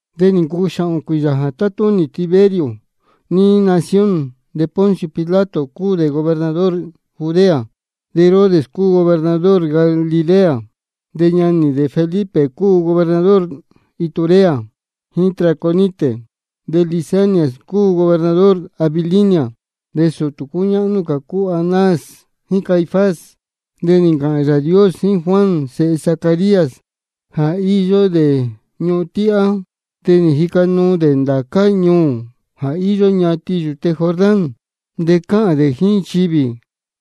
De nī ncuu xāhōn cuīyā jā tátúnī Tiberio níí nación. De Poncio Pilato cúu dē gobernador Judea, de Herodes cúu gobernador Galilea, de ñanī dē Felipe cúu gobernador Iturea jíín Traconite, de Lisanias cúu gobernador Abilinia. De sūtū cúñáhnú cā cúu Anás jíín Caifás. De nī ncāhān Yāā Dios jíín Juan sēhe Zacarías, jā íyó dē ñuhun tíhá. De nī jica nuu dē ndācá ñuū jā íyó ñatin yūte Jordán. De cáhān dē jíín nchivī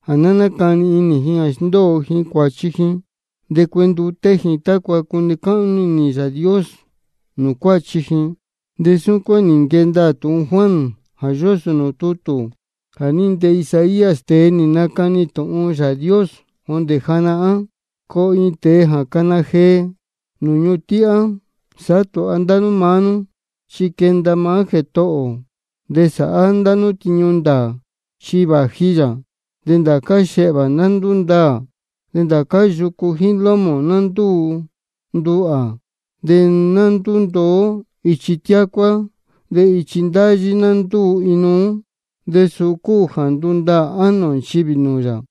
jā ná nácani inī ji jā sndóo ji cuāchi ji de cuenduté ji, tácua cune cáhnú inī Yāā Dios nūū cuáchi ji. De súcuán nī nquee ndaā tūhun Juan jā yósō nūū tutū jā ní ntee Isaías, tēe nī nacani tūhun Yāā Dios jondē janahán: Coo iin tēe jā cana jee jondē nūū ñuhun tíhá: Sāhá tūha ndá nú maá nú, chi quenda maá Jētohō ō, de sāhá ndá nú tiñu ndāā, chi vāji yā. De ndācá xehvā ná ndúndaā, de ndācá yucu jíín lómō ná ndúu nduhā, de ná ndúndoó ichi tiácuá, de ichi ndáyí ná ndúu inuú. De suu cúu jā ndundaā ánō nchivī nūū yā.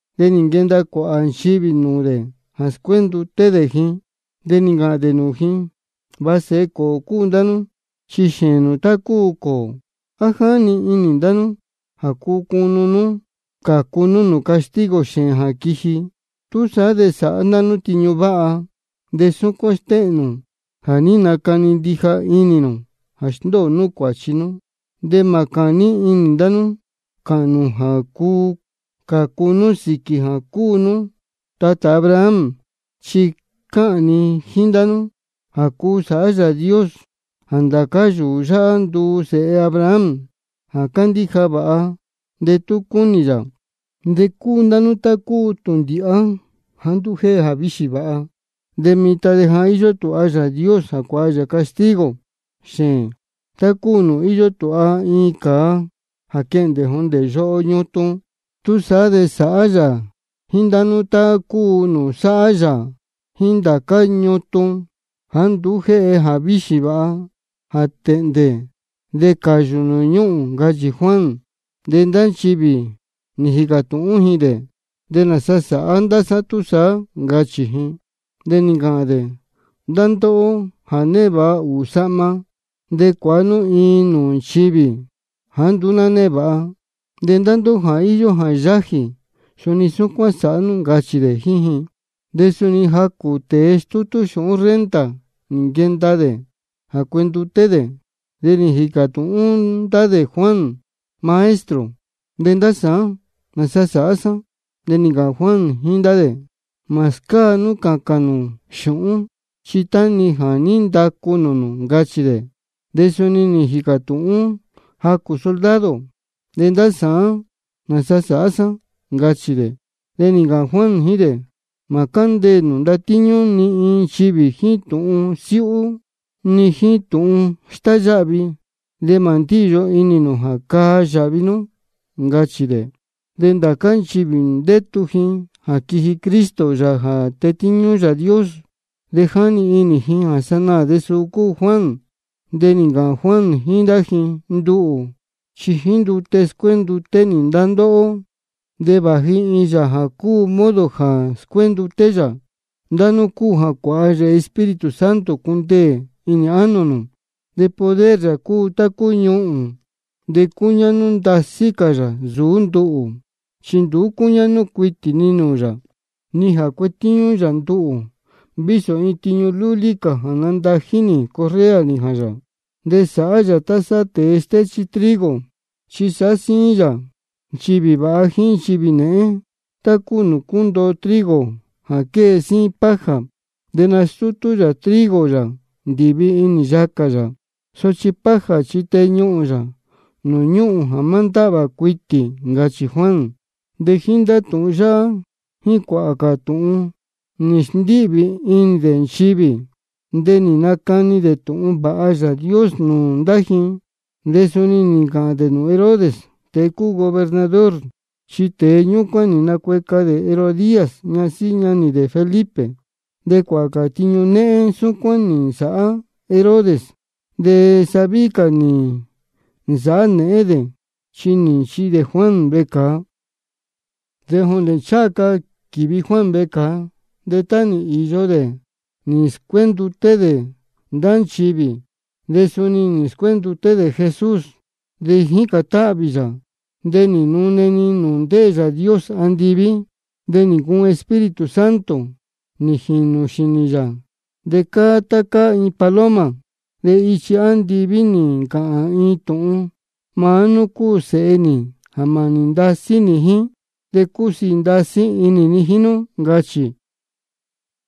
De nī nquenda cuāhā nchivī nūū dē jā scuénduté dē ji. De nī ncāhān dē nūū ji: Va sēhe cōō cúu ndá nú, chi xēēn nū tá cúu cōō. ¿A jáni inī ndá nú jā cuu cunu nú cācu nú nūū castigo xēēn jā quiji? Túsaá de sāhá ndá nú tiñu váha, de súcuán stéhēn nū jā ní nacani ndija inī nū jā sndóo nú cuāchi nú. De mā cāní inī ndá nú cāhān nū jā cuu cācu nú sīquī jā cúu nú tatā Abraham. Chi cáhān ni jíín ndá nú jā cuu sāhá Yāā Dios jā ndācá yūū yáhá nduu sēhe Abraham jā candíja vāha, de tú cúnī yā. De cúu ndá nú tá cúu tūndīhá jāá nduú jéhe jāvíxī vāha. De mitan de ja íyó tūha Yāā Dios jā cuāha yā castigo xēēn, tá cúu nūū íyó tūha iin cāa jā quehndē jondē yoho ñutun. Túsaá de sāhá yā jíín ndá nú tá cúu nūū sáhá yā jíín ndācá ñutun jāá nduú jéhe jāvíxī vāha, jā tēhndē de cāyū nūū ñúhūn, ncachī Juan. De ndá nchivī nī jīcā tūhún ji dē: ¿De nāsa sāhá ndá sá túsaá? ncachī ji. De nī ncāhān dē: Ndá ndóhó jā névāha ūū sahma, de cuāha nú iin nūū nchivī jāá nduú ná névāha. De ndá ndóhó jā íyó jā yájī, suni súcuán sāhá nú, ncachī dē jíín ji. De suni jacū tēe stútú xūhún renta nī nquenda dē jā cuenduté dē. De nī jīcā tūhún ndá dē Juan: Maestro, ¿de ndá sāán, nāsa sāhá sá? De nī ncāhān Juan jíín ndá dē: Mā scáa nú cācān nū xūhún, chi tá-ni jā ní ndacu nūū nū, ncachī dē. De suni nī jīcā tūhún jacū soldado: ¿De ndá sāán, nāsa sāhá sá? ncachī dē. De nī ncāhān Juan jíín dē: Mā cándeē nū ndatíñú ni iin nchivī jíín tūhun siúhú ni jíín tūhun stáyáhvi, de mā ndíyo inī nū jā caa yāhvi nú, ncachī dē. De ndācá nchivī ndétu ji jā quiji Cristo, Yāā jā tetíñú Yāā Dios, de jáni inī ji jā sanaā de suu cúu Juan. De nī ncāhān Juan jíín ndá ji: Nduhū chi jíín ndute scuénduté nī ndá ndóhó. De vāji iin Yāā jā modo jā scuénduté yā ndá nú cúu jā cuāha yā Espíritu Santo cundeē inī ánō nū, de poder yā cúu tá cúu ñuhūn. De cuñáhnú ndasí cā yā nsūú nduhū, chi nduú cúñáhnú cuitī ni nūū yā, ni jā cuetíñú yā nduhū vísō iin tiñu lúlí cā jā nandají nī correa nījān yā. De sāhá yā tá sáhá tēe stéchí trigo, chi sāhá síín yā nchivī vāha jíín nchivī nēhén, tá cúu nūū cúndoo trigo jā quée síín paja. De nastútú yā trigo yā ndīvi inī yacā yā. Sochi paja chi teñuhūn yā nūū ñúhūn jā má ndáhvā cuitī, ncachī Juan. De jíín ndá tūhun yáhá jíín cuāhā cā tūhun nī sndíhvī inī dē nchivī, de nī nacani dē tūhun vāha Yāā Dios nūū ndá ji. De suni nī ncāhān dē nūū Herodes, tēe cúu gobernador, chi tēe ñúcuán nī nacueca dē Herodías, ñasíhí ñanī dē Felipe. De cuāhā cā tiñu néhén súcuán nī nsāhá Herodes. De sa víhí cā nī nsāhá nēhén dē, chi nī nchihi dē Juan vecāa. De jondē ncháha ca quīvi Juan vecāa, tá nī īyo dē jā ní scuénduté dē ndá nchivī, de suni nī scuénduté dē Jesús. De jícān táhvī yā, de nī nune-ni nūū ndéē Yāā Dios andiví. De nī ncuun Espíritu Santo nī jīnū xīnī yā, de cáá tá cáá iin paloma. De ichi andiví nī ncāhān iin tūhun: Maá nú cúu Sēhe nī jā mānī ndasí nī jíín, de cúsiī ndasí inī ni jíín nú, ncachī.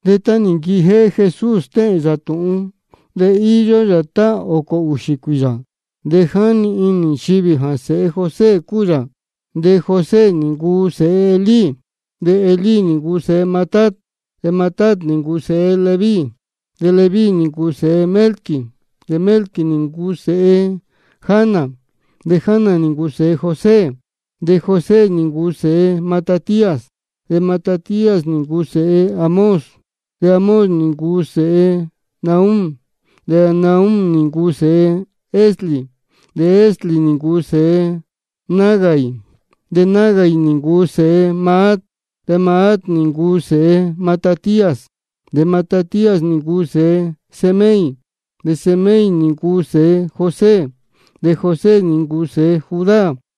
De tá nī nquijéhé Jesús stéhēn yā tūhun, de íyó yā tá ōcō ūxī cuīyā. De jáni inī nchivī jā sēhe José cúu yā. De José nī ncuu sēhe Elí, de Elí nī ncuu sēhe Matat, de Matat nī ncuu sēhe Leví, de Leví nī ncuu sēhe Melqui, de Melqui nī ncuu sēhe Jana, de Jana nī ncuu sēhe José, de José nī ncuu sēhe Matatías, de Matatías nī ncuu sēhe Amós, de Amós nī ncuu sēhe Nahum, de Nahum nī ncuu sēhe Esli, de Esli nī ncuu sēhe Nagai, de Nagai nī ncuu sēhe Maat, de Maat nī ncuu sēhe Matatías, de Matatías nī ncuu sēhe Semei, de Semei nī ncuu sēhe José, de José nī ncuu sēhe Judá,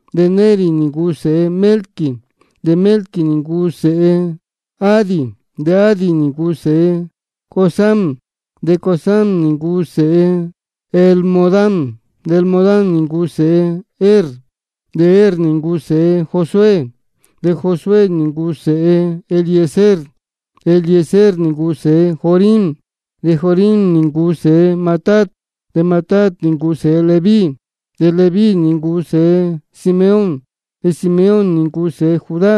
de Neri nī ncuu sēhe Melqui, de Melqui nī ncuu sēhe Adi, de Adi nī ncuu sēhe Cosam, de Cosam nī ncuu sēhe Elmodam, de Elmodam nī ncuu sēhe Er, de Er nī ncuu sēhe Josué, de Josué nī ncuu sēhe Eliezer, de Eliezer nī ncuu sēhe Jorim, de Jorim nī ncuu sēhe Matat, de Matat nī ncuu sēhe Leví, de Leví nī ncuu sēhe Simeón, de Simeón nī ncuu sēhe Judá,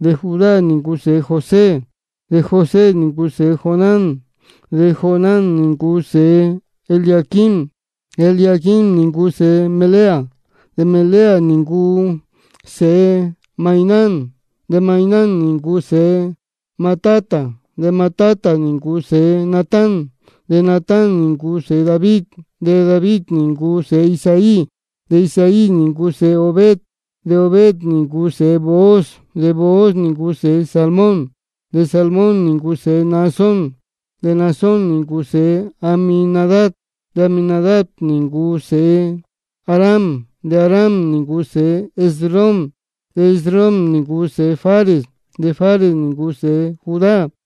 de Judá nī ncuu sēhe José, de José nī ncuu sēhe Jonán, de Jonán nī ncuu sēhe Eliaquim, de Eliaquim nī ncuu sēhe Melea, de Melea nī ncuu sēhe Mainán, de Mainán nī ncuu sēhe Matata, de Matata nī ncuu sēhe Natán, de Natán nī ncuu sēhe David, de David nī ncuu sēhe Isaí, de Isaí nī ncuu sēhe Obed, de Obed nī ncuu sēhe Booz, de Booz nī ncuu sēhe Salmón, de Salmón nī ncuu sēhe Naasón, de Naasón nī ncuu sēhe Aminadab, de Aminadab nī ncuu sēhe Aram, de Aram nī ncuu sēhe Esrom, de Esrom nī ncuu sēhe Fares, de Fares nī ncuu sēhe Judá,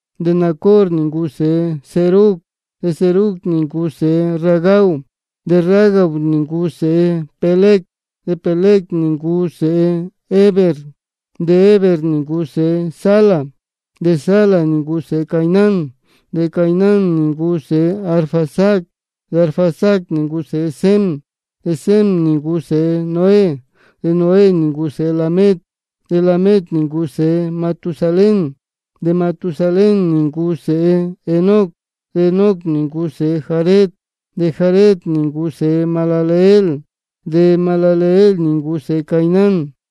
de Nacor nī ncuu sēhe Serug, de Serug nī ncuu sēhe Ragau, de Ragau nī ncuu sēhe Peleg, de Peleg nī ncuu sēhe Heber, de Heber nī ncuu sēhe Sala, de Sala nī ncuu sēhe Cainán, de Cainán nī ncuu sēhe Arfaxad, de Arfaxad nī ncuu sēhe Sem, de Sem nī ncuu sēhe Noé, de Noé nī ncuu sēhe Lamec, de Lamec nī ncuu sēhe Matusalén, de Matusalén nī ncuu sēhe Enoc, de Enoc nī ncuu sēhe Jared, de Jared nī ncuu sēhe Mahalaleel, de Mahalaleel nī ncuu sēhe Cainán,